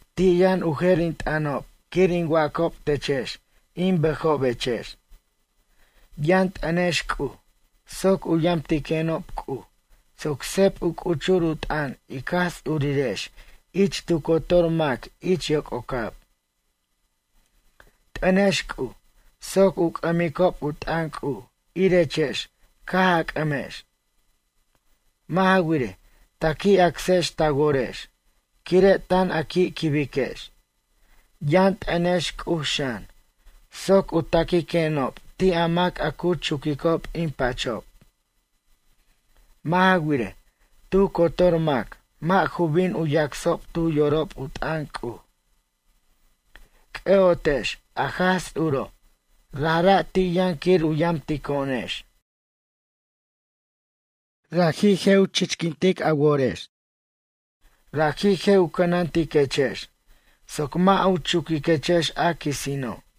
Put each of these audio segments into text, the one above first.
Ti' yʌn u jer in t'ʌnob quir in wacob techex in bʌjobechex. Yʌn t'ʌnex C'uj soc u yamtiquenob C'uj soc seb u c'uchur u t'ʌn ic Jaj Ts'urirex ich tu cotor mac ich yoc'ocab. T'ʌnex C'uj soc u c'ʌmicob u t'ʌn C'uj irechex caj a c'ʌmex. Mʌ' ja wirej, ta qui' acsex ta worex quire' tan a qui' quibiquex. Yʌn t'ʌnex C'uj xan, soc u taquiquenob ti' a mac a cu chuquicob in pachob. Mʌ' ja wirej, tu cotor mac mʌ' ju bin u yacsob tu yorob u t'ʌn C'uj. C'ʌ'otex a Jaj Ts'uro', rajra' ti' yʌn quir u yamtico'onex. Raji' je' u chichquintic a worex. Raji' je' u cʌnantiquechex soc mʌ' u chuquiquechex a quisino'.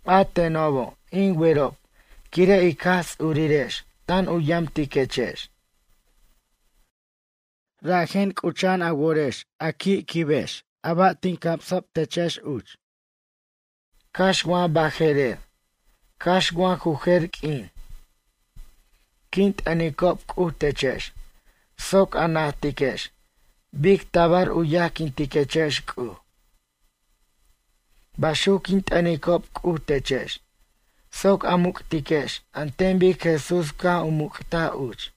A tenobo' in werob quire' ic Jaj Ts'urirex tan u yamtiquechex. Rajen c'ucha'an a worex a qui'quibex a ba' tin camsob techex uch. Cax wa baje'rer cax wa ju jer q'uin. Quin t'ʌnicob C'uj techex soc a najtiquex bic tabar u yajquintechex C'uj. Baxuc quin t'ʌnicob C'uj techex soc a muc'tiquex an ten bic Jesús caj u muc'taj uch.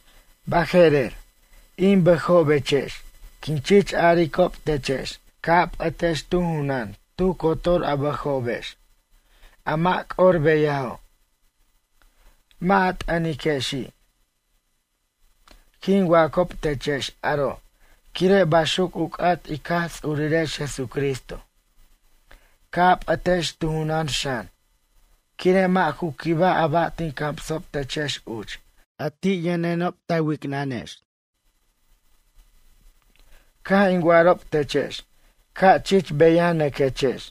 Baje'rer, in bʌjobechex quin chich aricob techex ca' a p'ʌtex tu junʌn tu cotor a bʌjobex, a mʌ' c'or beyajo'. Mʌ' a t'ʌniquexi'. Quin wacob techex aro' quire' baxuc u c'at ic Jaj Ts'urirex Jesucristo. Ca' a p'ʌtex tu junʌn xan, quire' mʌ' ju quibaj a ba' tin camsob techex uch a ti' yʌnenob ta wicnʌnex. Caj in wa'arob techex ca' chich beyanʌquechex.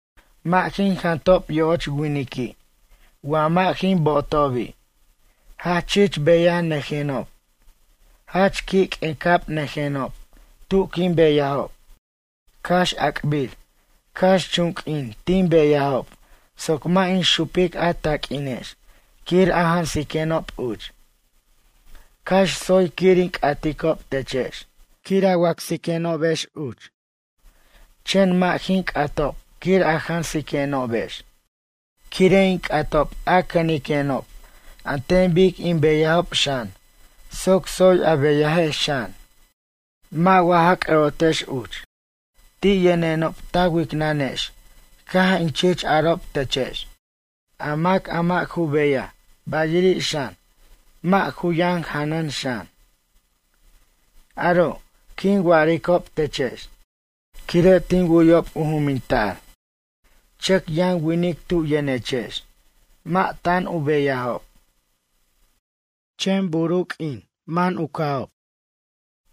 Mʌ' jin jantob yo'och winiqui' wa mʌ' jin bo'otobi'. Jach chich beyanʌjenob, jach q'uic'abnʌjenob tu quin beyajob. Cax a'ac'bir, cax chun q'uin tin beyajob soc mʌ' in xupic a taq'uinex quir a jansiquenob uch. Cax tsoy quir in c'aticob techex, quir a wacsenobex uch chen mʌ' jin c'atob quir a jansiquenobex. Quire' in c'atob a cʌniquenob an ten bic in beyajob xan soc tsoy a beyajex xan. Mʌ' wa ja c'ʌ'otex uch ti' yʌnenob ta wicnʌnex caj in chich arob techex: A mac a mʌ' ju beyaj bayiri' xan mʌ' ju yʌn janʌn xan. Aro' quin wa'aricob techex quire' tin wu'yob u juminta'r chʌc yʌn winic tu yʌnechex mʌ' tan u beyajob. Chen bur u q'uinin man u ca'ob,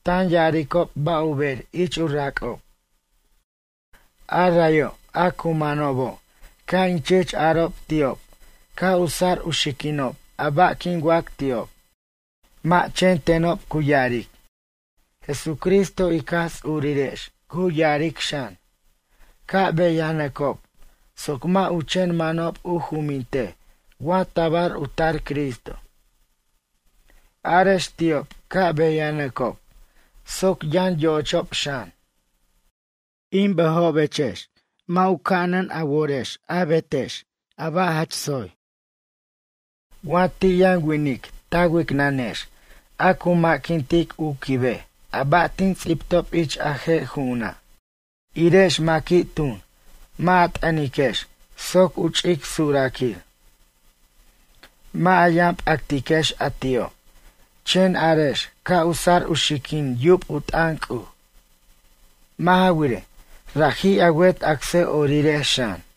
tan ya'aricob ba' u ber ich u rac'ob. A rayo' a cu manobo' ca' in chich arob ti'ob ca' u sar u xiquinob a ba' quin wac ti'ob. Mʌ' chen tenob cu ya'aric, Jesucristo ic Jaj Ts'urirex cu ya'aric xan: Ca' beyanʌcob soc mʌ' u chen manob u jumintej wa tabar u tar Cristo. Arex ti'ob ca' beyanʌcob soc yʌn yo'ochob xan. In bʌjobechex mʌ' u ca'anan a worex a betex a ba' jach tsoy. Wa ti' yʌn winic ta wicnʌnex a cu ma'quintic u quibej a ba' tin ts'ibtob ich a je' ju'una'. Irex maqui', tun mʌ' a t'ʌniquex soc u ch'ic suraquir. Mʌ' a yʌn p'actiquex a ti'o' chen arex ca' u sar u xiquin yub u t'ʌn C'uj. Mʌ' ja wirej, raji' a wet acsʌ'orirex xan.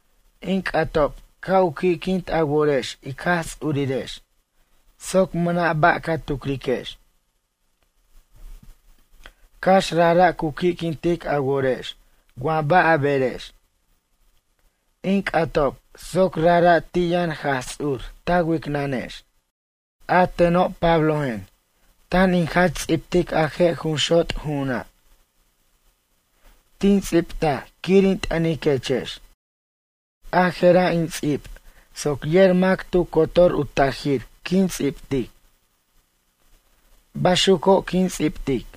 In c'atob ca' u qui'quint a worex ic Jaj Ts'urirex soc mʌna' ba' ca tucriquex. Cax rajra' cu qui'quintic a worex wa ba' a berex. In c'atob soc rajra' ti' yʌn Jaj Ts'ur ta wicnʌnex. A teno' Pablojen, tan in jach ts'ibtic a je' jun xot' ju'una'. Tin ts'ibtaj quir in t'ʌniquechex. A je'ra' in ts'ib soc yer mac tu cotor u tajir quin ts'ibtic. Baxuco' quin ts'ibtic.